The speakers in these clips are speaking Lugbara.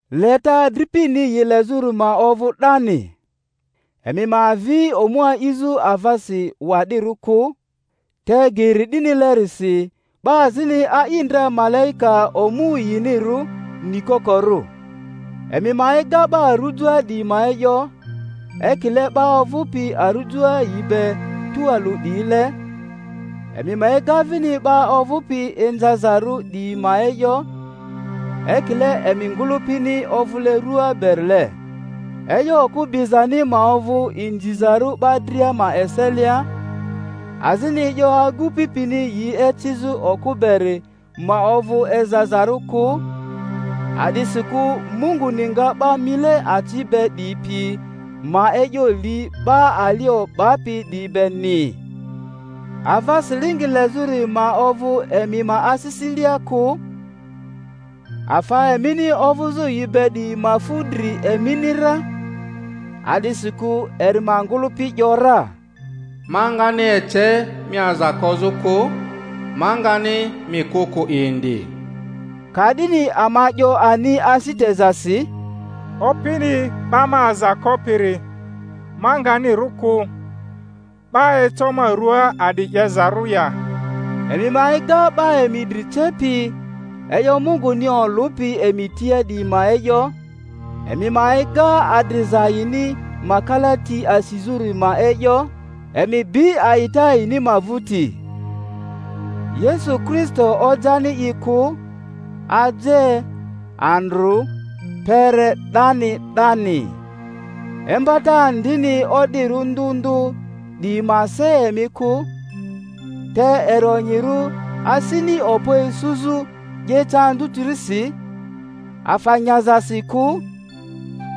Leta adripini yi lezᴜri ma ovᴜ 'dani. Emi ma avi omu a'izᴜ avasi wa'dirᴜ kᴜ, te geri 'dinilerisi 'ba azini a'i ndra malaika omu yinirᴜ, nikokorᴜ. Emi ma ega 'ba arᴜjoa 'diyi ma e'yo, ekiile 'ba ovᴜpi arujoa yi be tualᴜ 'diyile; emi ma ega vini 'ba ovᴜpi inzazarᴜ 'diyi ma e'yo, ekile emi ngᴜlᴜpini ovᴜle rua berile. E'yo okᴜ bizani ma ovᴜ inzizarᴜ 'ba dria ma eselia, azini e'yo agupi pini yi ecizᴜ okᴜ beri ma ovᴜ ezazarᴜ kᴜ; a'disikᴜ Munguni nga 'ba mile aci be 'diyi pi ma e'yo li 'ba ali o'bapi 'diyi beni. Ava silingi lezᴜri ma ovᴜ emi ma asisilea kᴜ, afa emini ovᴜzᴜ yi be 'diyi ma fu dri emini ra; a'disikᴜ eri ma ngᴜlᴜpi ‘yora, Ma ngani ece mi aza kozᴜ kᴜ, ma ngani mi kᴜ kᴜ indi. Ka'dini ama 'yo ani asi tezasi, Opini 'ba ma aza kopiri, ma ngani rᴜ kᴜ; 'ba eco ma rᴜaa a'di 'yezarᴜ ya? Emi ma ega 'ba emi dri cepi, e'yo Munguni olᴜpi emi tia 'diyi ma e'yo; emi ma ega adriza yini ma kalati asizᴜri ma e'yo, emi bi a'ita yini ma vᴜti. Yesu Kristo ojani i kᴜ, aje, andrᴜ, kpere 'dani 'dani. Imbata andini o'dirᴜ ndᴜ ndᴜ 'diyi ma se emi kᴜ; te eri onyirᴜ asini okpo isuzᴜ 'yeta anzᴜtirisi, afa nyazasi kᴜ,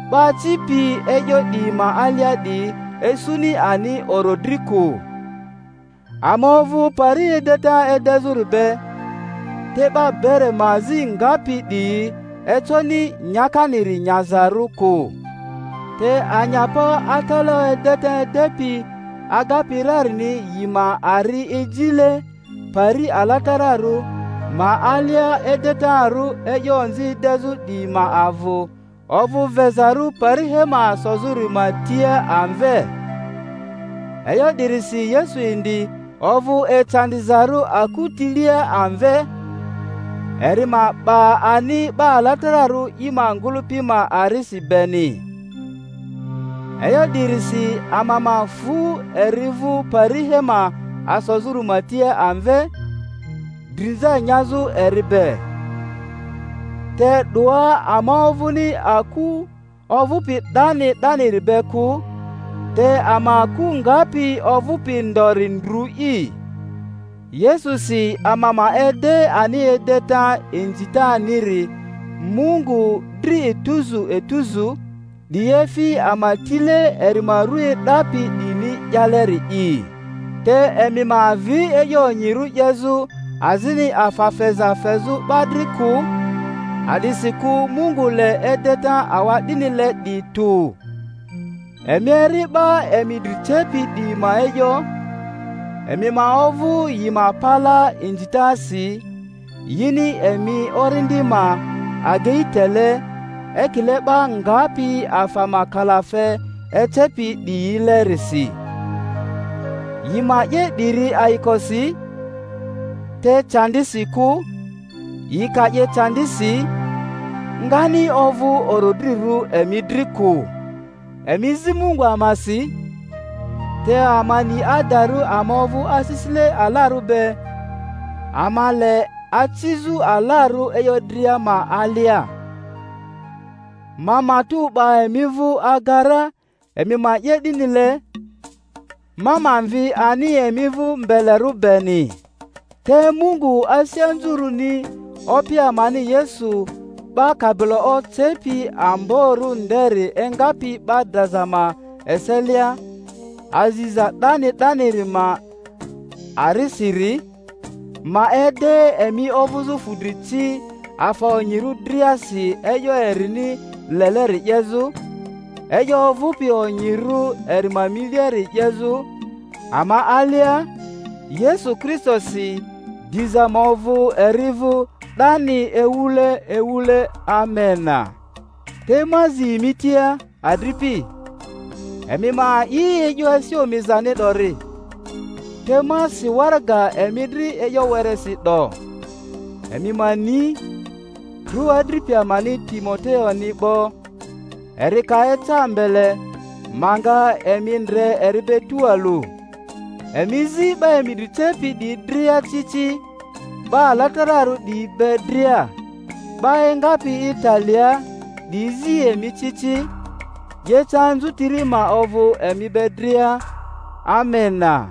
'ba acipi e'yo 'diyi ma alia 'diyi isuni ani orodri kᴜ. Ama ovᴜ pari edeta edezᴜri be, te 'ba bere ma azi ngapi 'diyi econi nyakaniri nyazarᴜ kᴜ. Te anyapa atalaᴜ edeta edepi agapi rarini yi ma ari ejile pari alatararᴜ ma alia edetarᴜ e'yo onzi edezᴜ 'diyi ma avᴜ ovᴜ vezarᴜ pari hema asozᴜri ma tia amve. E'yo 'dirisi Yesu indi ovᴜ ecandizarᴜ aku tilia amve, eri ma 'ba ani 'ba alatararᴜ i ma ngᴜlᴜpi ma arisi beni. E'yo 'dirisi ama ma fᴜ eri vᴜ pari hema asozᴜri ma tia amve, drinza nyazᴜ eri be. Te 'doa ama ovᴜni aku ovᴜpi 'dani 'daniri be kᴜ, te ama aku ngapi ovᴜpi ndori ndrᴜ'i. Yesusi ama ma ede ani edeta inzitaniri Mungu dri etuzu etuzu, 'di efi ama tile eri ma ru e'dapi 'diyini 'yaleri'i. Te emi ma avi e'yo onyirᴜ 'yezᴜ azini afa feza fezᴜ 'ba dri kᴜ, a'disikᴜ Mungu le edeta awa'dinile 'diyi tᴜ. Emi eri 'ba emi dri cepi 'diyi ma e'yo, emi ma ovᴜ yi ma palaa inzitasi; yini emi orindi ma agei tele.. ekile 'ba ngapi afa ma kalafe ecepi 'diyilerisi. Yi ma 'ye 'diri ayikosi, te candisi kᴜ; yi ka 'ye candisi, ngani ovᴜ orodrirᴜ emi dri kᴜ. Emi zi Mungu amasi, te ama ni adarᴜ ama ovᴜ asisile alarᴜ be, ama le acizᴜ alarᴜ e'yo dria ma alia. Ma matᴜ 'ba emi vᴜ aga ra emi ma 'ye 'dinile, ma ma mvi ani emi vᴜ mbelerᴜ beni. Te Mungu asi anzurᴜni Opi amani Yesu 'ba kabilo ocepi amborᴜ nderi engapi 'ba draza ma eselia, aziza 'dani 'daniri ma arisiri, ma ede emi ovᴜzᴜ fudri ci afa onyirᴜ driasi e'yo erini leleri 'yezᴜ, e'yo ovᴜpi onyirᴜ eri ma miliari 'yezᴜ ama alia, Yesu Kristosi; diza ma ovᴜ eri vᴜ 'dani ewule ewule. Amena. Te ma azi emi tia, adripi, emi ma a'i e'yo asi omizani 'dori, te ma si waraga emi dri e'yo weresi 'do. Emi ma ni, trᴜ adripi amani Timoteoni 'bo; eri ka eca mbele, ma nga emi ndre eri be tualᴜ. Emi zi 'ba emi dri cepi 'diyi dria ci ci, 'ba alatararᴜ 'diyi be dria. 'Ba engapi Italiaa 'diyi zi emi ci ci. 'Yeta anzutiri ma ovᴜ emi be dria. Amena.